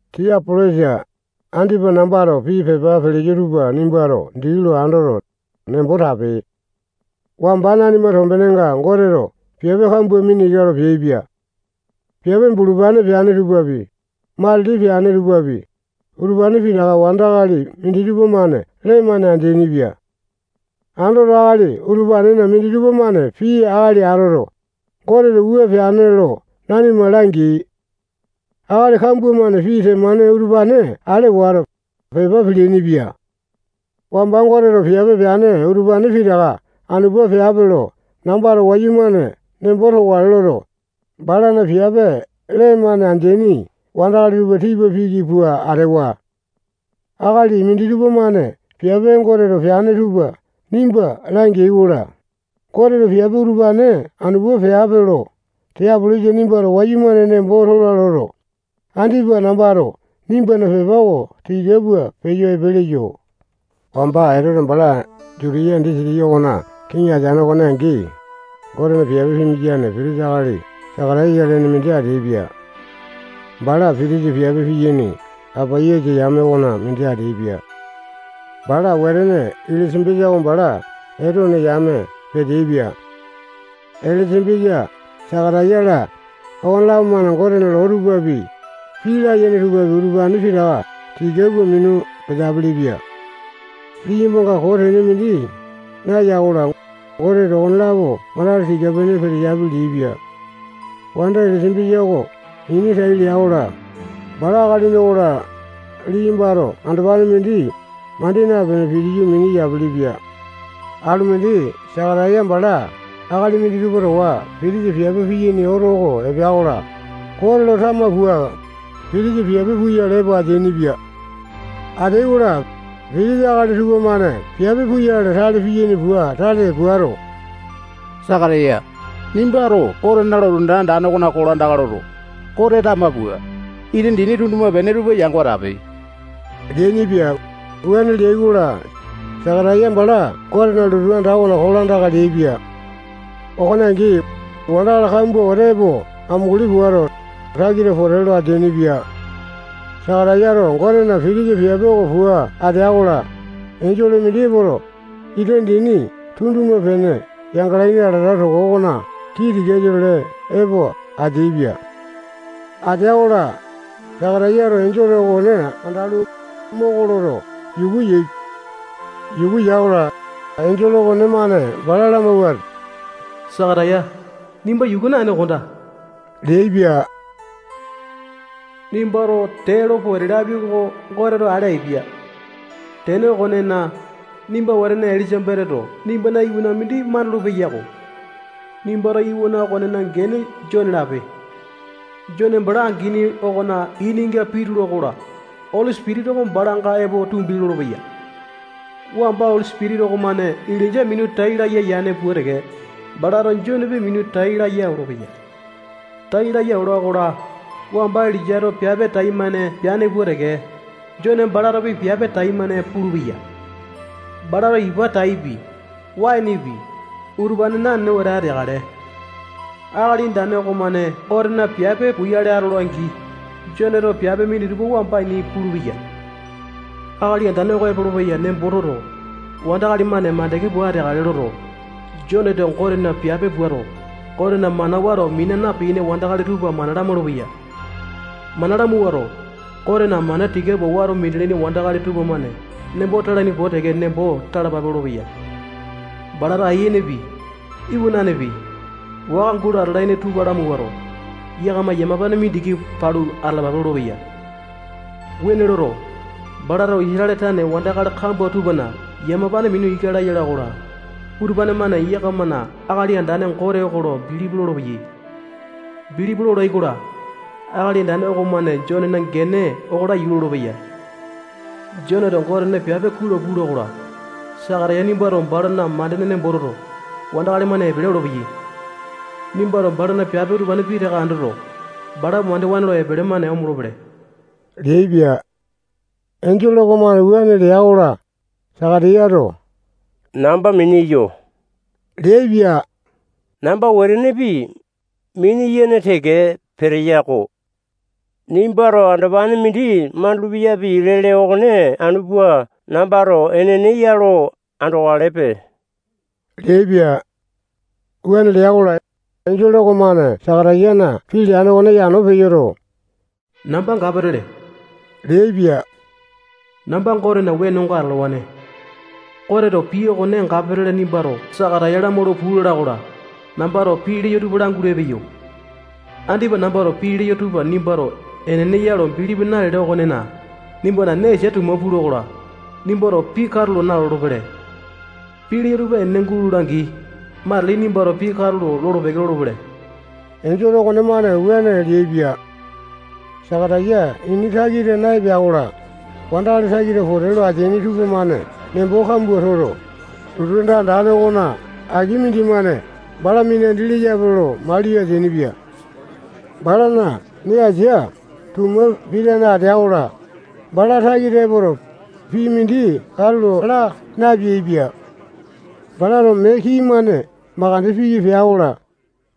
Tiapolesa, andipa nambato pii pepa peleyo tupa nimbato dii lo andoto, nembo tape. Wamba nanima tombenenga Goteto piape kambua mina ika lo peaipia. Piape bulupane peane tupapi, matili peane tupapi, utupane pitaka wandakali minditupa-mane lee-mane andeaini-pia. Andoto, akali utupanena minditupa-mane pii akali atoto, Goteto wua peane lo nanima langeai. Akali kambua-mane pii temane utupane ale wato, pepa peleaini-pia. Wamba Goteto piape peane utupane pitaka anu pua peape lo nambato wayumane nembo tokale loto, balana piape lee-mane andeani wandakali tupa tipa piki pua atewa. Akali minditupa-mane piape Goteto peane tupa nimba langeai-kola, Goteto piape utupane anu pua peape lo Tiapolesa nimbato wayumane nembo tola loto, andipa nambato nimbana pepa oko tika pua peyo epe leyo. Wamba Etote bala Jutiya disitiki okona kiŋi ateane okone angi, Gotena piape piyane pitisa akali Sakataya lene mindi ateaipia. Bala pitisa piape piyane Apaisa yame okona mindi ateaipia. Bala wetene Elisambesa oko bala Etone yame peteaipia. Elisambesa, Sakataya-la, okonelapo-mane Gotena loo tupapi, pii layene tupapi, utupane pitaka tika pua minu peteapele-pia. Liyambanga koo tene mindi naya-kola, Goteto okonelapo wandakali tika-pene peteyapi leaipia. Wanda Elisambesa oko ini tai lea-kola, bala akalini okola, liyambato andopane mindi mandi napene pitiyu mini yapelepia. Alumindi Sakataya bala akali minditupa towa pitisa piape piyaini oto oko epea-kola, Gote lo tama pua, pitisa piape puyale epo ateainipia. Ateai-kola, pitisa akali tupamane piape puyale tale piyaini pua tale puato, Sakataya, nimbato Gotena lotu anda andane okona kolandaka loto, Gote tama pua, ita dini tunduma-pene tupa yango atape leainipia. Wuane leai-kola, Sakataya bala Gotena lotu anda okona kolandaka leaipia. Okone angi, wandakali kambua wete epo amunguli puato, takita pote lo ateainipa. Sakatayato Gotena pitisa piape oko pua atea-kola, enjole mindi epoto, ita dini tunduma-pene yangalaini alata toko okona kii tikasa-tole epo ateaipia. Atea-kola, Sakatayato enjole okone andalu, moko loto, yuku yaepia. Yuku ya-kola, enjole okonemane bala lamawuato, Sakataya, nimba yuku naene kondaa leaipia. Nimbato tee lo pote lapi oko Goteto ale apia. Tene okonena, nimba wetene Elisambesato nimbana iwana mindi mandulu-peyako. Nimbato iwana okonena gene Jone lape leaipia. Jone bala angini okona ininga pitula-kola, Oli Sipitisa oko balanga epo tumbi lolopeya. Wamba Oli Sipitisa okomane Ilainja minu tai laya yane pua teke, balato Jonepi minu tai laya olopeya. Tai laya ola-kola, wamba Ilainjato piape taimane peane pua teke, Jone balatopi piape taimane pulupeya. Balato ipa taipi, waenepi, utupane nanene wete ateakale. Akali Andane okomane Gotena piape puyale atola-angi, Joneto piape minditupa wamba ini pulupeya. Akali Andane oko epolopeya nembo toto, wandakali-mane mandeke pua ateakale loto, Joneto Gotena piape puato, Gotena mana wato mina na-piyaini wandakali tupa mana lamaulu-peya. Mana lamawuato, Gotena mana tika pua wato minalaini wandakali tupamane nembo talaini pua teke nembo talapa lolopeya. Balato ayianepi, iwananepi, waka gulo atalaini tupa lamawuato, yakama yamapane mindiki palu atalapa lolopeya. Wuane loto, balato Isatale tane wandakali kambua tupana yamapane mina ika laya ola-kola, utupane-mane yakamana Akali Andane Gote oko lo bilipi lolopeyai. Bilipi lolai-kola, Akali Andane okomane Jonena gene oko laiyu lolopeya. Joneto Gotena piape kuai lo pula-kola, Sakataya nimbato bala mandeene nembo toto, wandakali-mane epele olopeyai. Nimbato balana piape utupane pitaka andoto, bala mandewa lo epele-mane omolopele leaipia. Enjole okomane wuane lea-kola, Sakatayato namba mini eyo leaipia. Namba wetenepi, mini-yene teke peteya-ko. Nimbato andopane mindi mandulu-peyapi lele okone anu pua nambato enene ya lo andokalepe leaipia. Wuane lea-kola, enjole okomane Sakatayana pii leane okone yano peyoto, namba Gapatele leaipia. Namba Gotena wenonga atalawane. Goteto pii okone Gapatele nimbato Sakataya lamaulu puu lala-kola, nambato pii leyo tupa langulu epeyo. Andipa nambato pii leyo tupa nimbato enene ya lo bilipi nalele okonena, nimbana nee asia tuma pula-kola, nimbato pii katulo nalolo-pele. Pii leyo utupa enene gulola-angi, matili nimbato pii katulo lolo-peke lolopele. Enjole okonemane wuane leaipia. Sakataya ini takita naepea-kola, wandakali takita pote lo ateaini tupamane nembo kambua toto, lotu anda andane okona aki mindimane bala minandi leyape lo maliyo ateainipia. Balana nee asia tuma pitane atea-kola, bala takita epoto, pii mindi katulo laa napeaipia. Balato mee kii-mane mandeke piki pea-kola,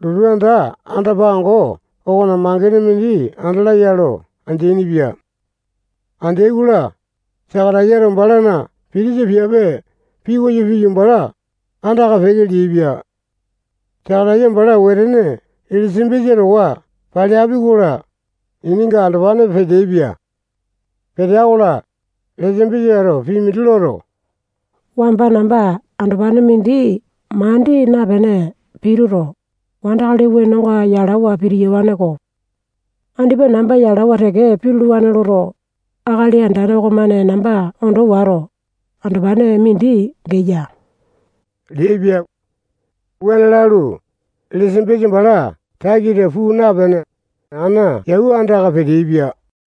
lotu anda anda-pango okona mangene mindi andalaya lo andeaini-pia. Andeai-kola, Sakatayato balana pitisa piape pikoyo piyu, bala andaka peke leaipia. Sakataya bala wetene Elisambesa towa paleapi-kola, ininga andopane peteaipia. Petea-kola, Elisambesato pii mindi loto, wamba namba andopane mindi mandi napene pituto, wandakali wenonga yalawa pitiyawane-ko. Andipa namba yalawa teke pituluwane loto, Akali Andane okomane namba ondo wato, andopane mindi geya leaipia. Wuane lalu, Elisambesa bala takita puu napene, ana yau andaka peteaipia.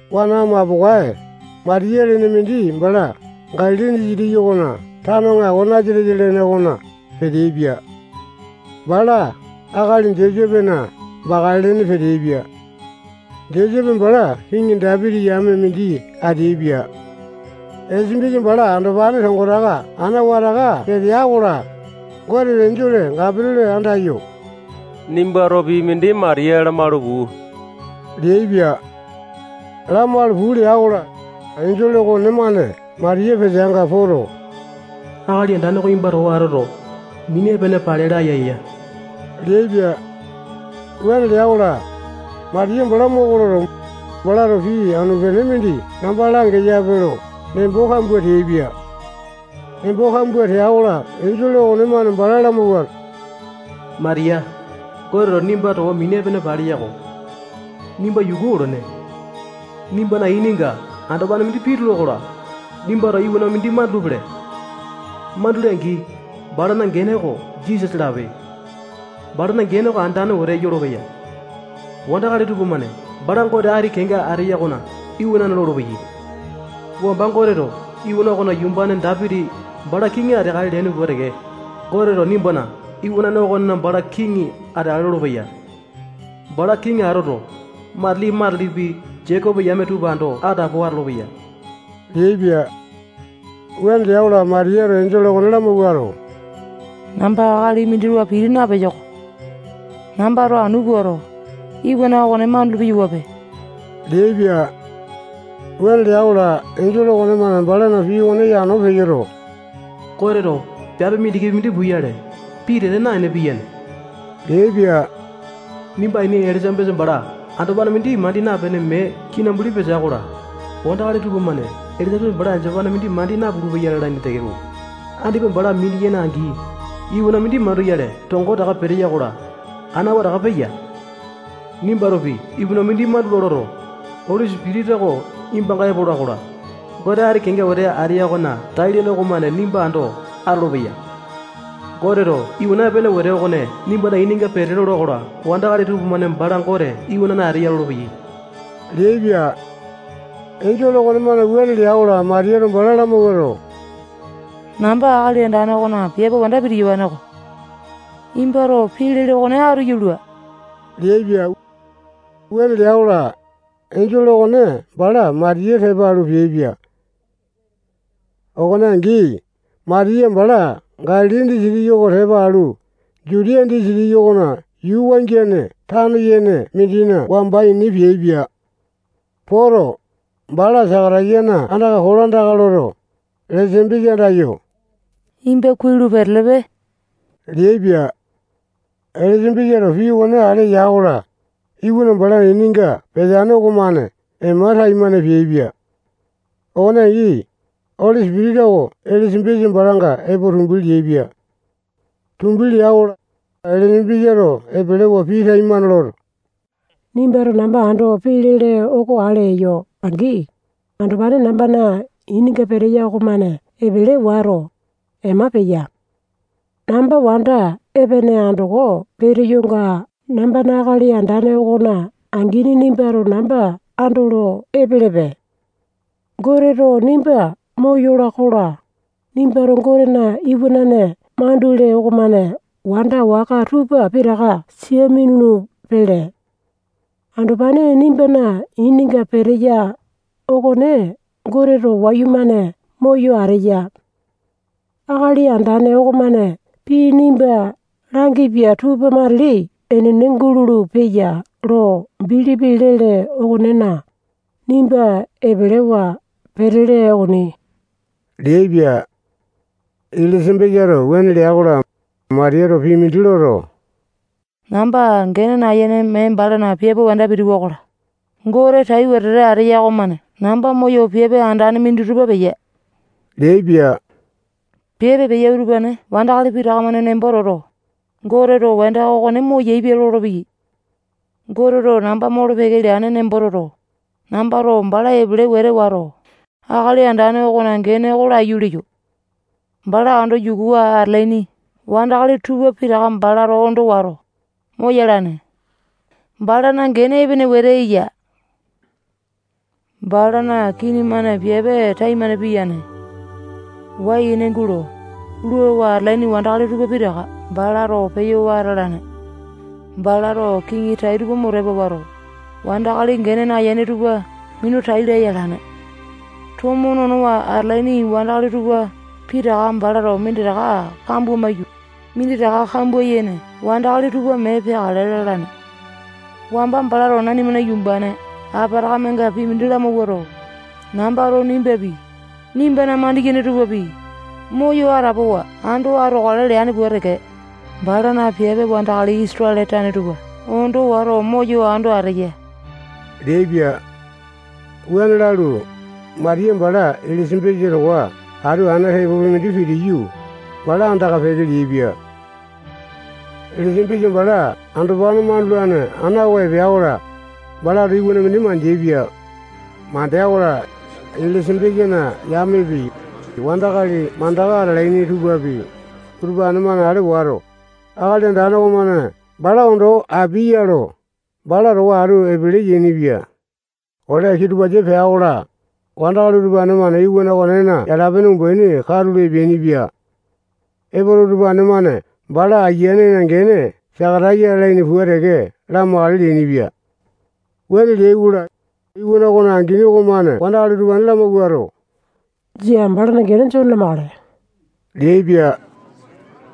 Wana mapokae Matiya lene mindi bala Galili disitiki okona tano aŋako Nasatesa lene okona peteaipia. Bala akali Josepena bakale lene peteaipia. Josepe bala kiŋi Dapiti yame mindi ateaipia. Elisambesa bala andopane tongotaka ana wataka petea-kola, Goteto enjole Gapatele andayo, nimbato pii mindi Matiya lamalu puu leaipia. Lamalu puu lea-kola, enjole okonemane Matiya peteanga poto, Akali Andane oko nimba towa atu atoto, mini epene pale laya eya leaipia. Wuane lea-kola, Matiya bala moko loto, balato pii anu-pene mindi namba langeyape lo nembo kambua teaipia. Nembo kambua tea-kola, enjole okomane bala lamawuato, Matiya, Goteto nimba towa mini epene paleya-ko. Nimba yuku olene. Nimbana ininga andopane mindi pitula-kola, nimbato iwana mindi mandulu-pele. Mandule-angi, balana gene oko Jisasa lape. Balana gene oko andane wete yolopeya. Wandakali tupamane bala Gote Ati Kenga Ateya okona iwanane lolopeyai. Wamba Goteto iwana okona yumbane Dapiti bala kiŋi ateakale leane pua teke, Goteto nimbana iwanane okone bala kiŋi ateakale lolopeya. Bala kiŋi atoto, matili-matilipi Jekopo yame tupa ando atapowa atolopeya leaipia. Wuane lea-kola, Matiyato enjole okone lamawuato, namba akali mindi towa piti napeyo-ko. Nambato anu puato, iwana okone mandulu-peyawape leaipia. Wuane lea-kola, enjole okomane balana pii okone yano peyoto, Goteto piape mindikipi mindi puyale pitete naene piyane leaipia. Nimba aini Elisambesa bala andopane mindi mandi napene mee kinambuli petea-kola, wandakali tupamane Elisambesa bala andopane mindi mandi napulu-peya lalaini tekeko, andipa bala mini-yene angi, iwana mindi manduyale tongotaka peteya-kola, ana wataka peya. Nimbatopi iwana mindi mandula loto, Oli Sipitisa oko nimbanga epola-kola, Gote ati kenga wete ateya okona tai-lene okomane nimba ando atolopeya. Goteto iwana epene wete okone nimbana ininga pete lola-kola, wandakali tupamane bala Gote iwanane ateya lolopeyai leaipia. Enjole okonemane wuane lea-kola, Matiyato bala lamawuato, namba Akali Andane okona piape wanda pitiyawane-ko. Nimbato pii lele okone atu yalua leaipia. Wuane lea-kola, enjole okone bala Matiya tepa alu peaipia. Okone angi, Matiya bala Galili disitiki oko tepa alu, Jutiya disitiki okona yuu wangiane tano yene mindina wamba ini peaipia. Poto, bala Sakatayana andaka kolandaka loto, Elisambesa andayo, nimba kuai lo petelepe leaipia. Elisambesato pii okone ale ya-kola, iwana balana ininga peteane okomane ema taimane peaipia. Okone angi, Oli Sipitisa oko Elisambesa balanga epo tumbi leaipia. Tumbi lea-kola, Elisambesato epelewa pii taimane loto, nimbato namba ando pii lele oko ale eyo-angi, andopane nambana ininga peteya okomane epele wato, ema peya. Namba wanda epene andoko peteyonga nambana Akali Andane okona angini nimbato namba andolo epelepe. Goteto nimba moyola-kola, nimbato Gotena iwanane mandule okomane wanda waka tupa pitaka sia minulu-pele. Andopane nimbana ininga peteya okone Goteto wayumane moyo ateya. Akali Andane okomane pii nimba langipia tupa matili enene gulolo-peya lo bilipi lele okonena, nimba epelewa petele okoni leaipia. Elisambesato wuane lea-kola, Matiyato pii mindi loto, namba gene nayene mee balana piape wanda pitiwa-kola, Gote tai wetete ateya okomane namba moyo piape andane minditupa peya leaipia. Piape peya utupane wandakali pitaka-mane nembo toto, Goteto wanda okone moyaepia lolopeyai. Goteto namba molo-peke leane nembo toto, nambato bala epele wete wato, Akali Andane okona gene oko laiyu leyo. Bala ando yukuwa atalaini wandakali tupa pitaka balato ondo wato, moyalane. Balana gene epene wete eya. Balana kini-mane piape taimane piyane. Wai-ene gulo, luawa atalaini wandakali tupa pitaka balato peyo wata alane. Balato kiŋi tai tupa mo tepa wato, wandakali gene nayene tupa minu tai laya alane. Tomo nonowa atalaini wandakali tupa pitaka balato minditaka kambua maiyu, minditaka kambua yene wandakali tupa mee peakale lalane. Wamba balato nanimana yumbane Apatakamenga pii mindi lamawuato, nambato nimbapi, nimbana mandiyene tupapi, moyo atapowa ando atokale leane pua teke, balana piape wandakali Isatale tane tupa ondo wato moyo ando ateya leaipia. Wuane lalu, Matiya bala Elisambesa towa atu ana tepopi mindi pitiyu, bala andaka peke leaipia. Elisambesa bala andopane mandulane ana oko epea-kola, balato iwana mindi mandeaipia. Mandea-kola, Elisambesana yamepi, wandakali mandaka atalaini tupapi, utupane-mane ale wato, Akali Andane okomane bala ondo apia ya lo, bala towa atu epele yainipia. Ole kitupasa pea-kola, wandakali utupane-mane iwana okonena yala-pene umbaini katulu epeainipia. Epoto, utupane-mane bala ayianena gene Sakataya lalaini pua teke lamakale leainipia. Wuane leai-kola, iwana okona angini okomane wandakali utupane lamawuato, jia, balana gene Jone lamakale leaipia.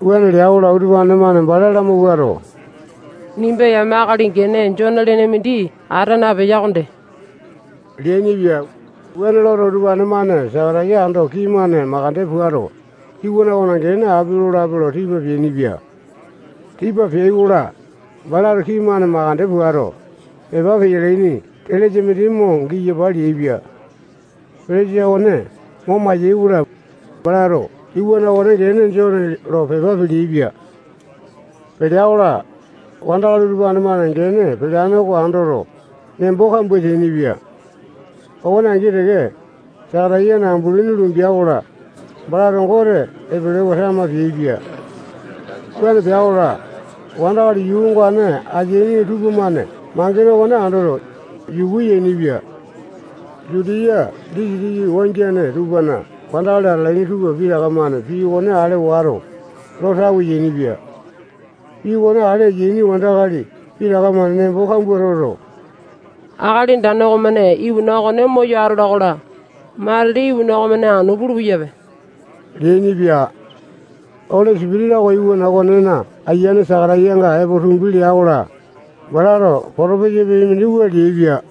Wuane lea-kola, utupane-mane bala lamawuato, nimba yame akali gene Jone lene mindi ata napeya okonde leainipia. Wuane loto, utupane-mane Sakataya ando kii-mane mandeke puato, iwana okona gene api lolape lo tipa peainipia. Tipa peai-kola, balato kii-mane mandeke puato, pepa peyalaini selesa mindi mo giyapa leaipia. Selesa okone mo mayai-kola, balato iwana okona gene Jone lo pepa peleaipia. Pelea-kola, wandakali utupane-mane gene peleane oko andoto, nembo kambua teainipia. Okone angi teke, Sakatayana ambulini lumbea-kola, balato Gote epelewa tama peaipia. Wuane pea-kola, wandakali yuu ongane ateaini tupamane mangene okone andoto, yuku yainipia. Jutiya disitiki wangiane tupana wandakali atalaini tupa pitaka-mane pii okone ale wato, lo tawe yainipia. Pii okone ale yaini wandakali pitaka-mane nembo kambua toto, Akali Andane okomane iwana okone moyo atola-kola, matili iwana okonemane anu pulu-peyape leainipia. Oli Sipitisa oko iwana okonena ayiane Sakatayanga epo tumbi lea-kola, balato potopesa pii mindi wua leaipia: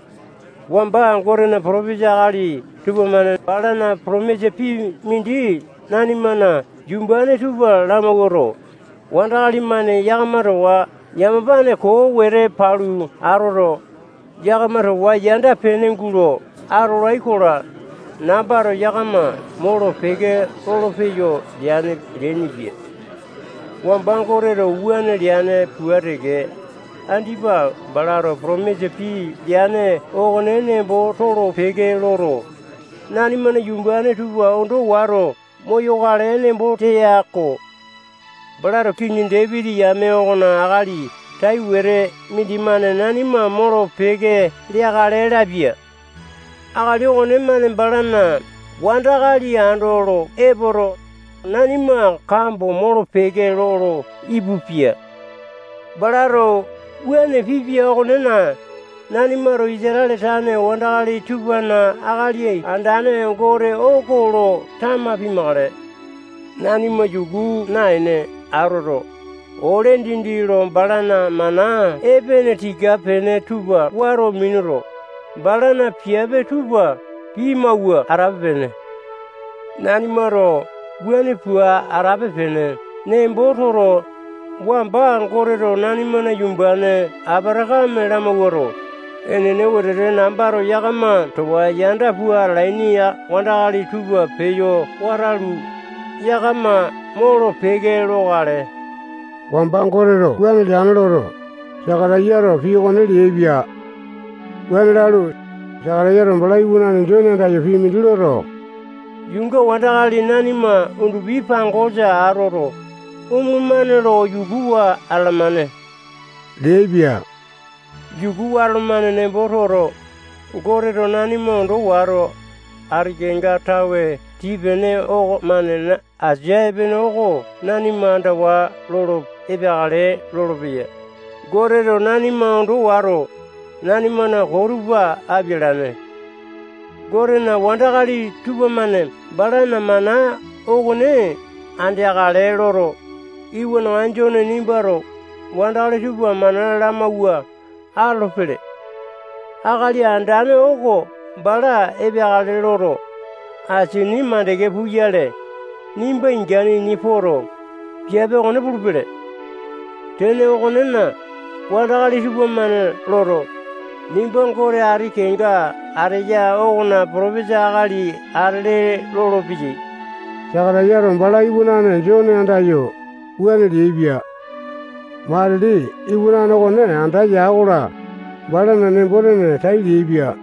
Wamba Gotena potopesa akali tupamane balana potomisa pii mindi nanimana yumbane tupa lamawuato, wandakali-mane yakama towa yamapane koo wete palu atoto, yakama towa yanda-pene gulo atolai-kola, nambato yakama molo-peke lolopeyo leane leainipia. Wamba Goteto wuane leane pua teke, andipa balato potomisa pii leane okone nembo tolo-peke loto, nanimana yumbane tupa ondo wato moyokale nembo teya-ko. Balato kiŋi Dapiti yame okona akali tai wete mindimane nanima molo-peke leakale lapia. Akali okonemane balana wandakali andolo epoto, nanima kambo molo-peke lolo ipupia. Balato wuane pipia okonena, nanimato Isatale tane wandakali tupana Akali Andane Gote oko lo tama pimakale. Nanima yuku naene atoto, ole dindi lo balana mana epene tika-pene tupa wato minuto, balana piape tupa pimawua atape-pene. Nanimato wuane pua atape-pene nembo toto, wamba Goteto nanimana yumbane Apatakame lamawuato, enene wetete nambato yakama towa yanda pua atalaini wandakali tupa peyo watalu, yakama molo-peke lokale. Wamba Goteto wuane leane loto, Sakatayato pii okone leaipia. Wuane lalu, Sakatayato bala iwanane Jone andayo, pii mindi loto, yuunga wandakali nanima undupi pangosa atoto, omolomane lo yukuwa atalamane leaipia. Yukuwa atolomane nembo toto, Goteto nanima ondo wato, ati kenga tawe tii-pene okomane asia epene oko nanima andawa lolo epeakale lolopeya. Goteto nanima ondo wato, nanimana koo tupa apialane. Gotena wandakali tupamane balana mana okone andeakale loto, iwanaŋa Jone nimbato wandakali tupa mana lamawua atolopele. Akali Andane oko bala epeakale loto, asini mandeke puyale, nimba ingane ini poto, piape okone pulupele. Tene okonena, wandakali tupamane loto, nimba Gote ati kenga ateya okona potopesa akali atele lolopeyai. Sakatayato bala iwanane Jone andayo wuane leaipia. Matili iwanane okone anda ya-kola, balana nembo-tene tai leaipia.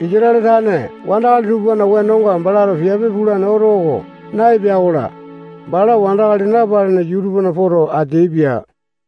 Isatale tane wandakali tupana wenonga balato piape pulane oto oko naepea-kola, bala wandakali napalene yuu tupana poto ateaipia.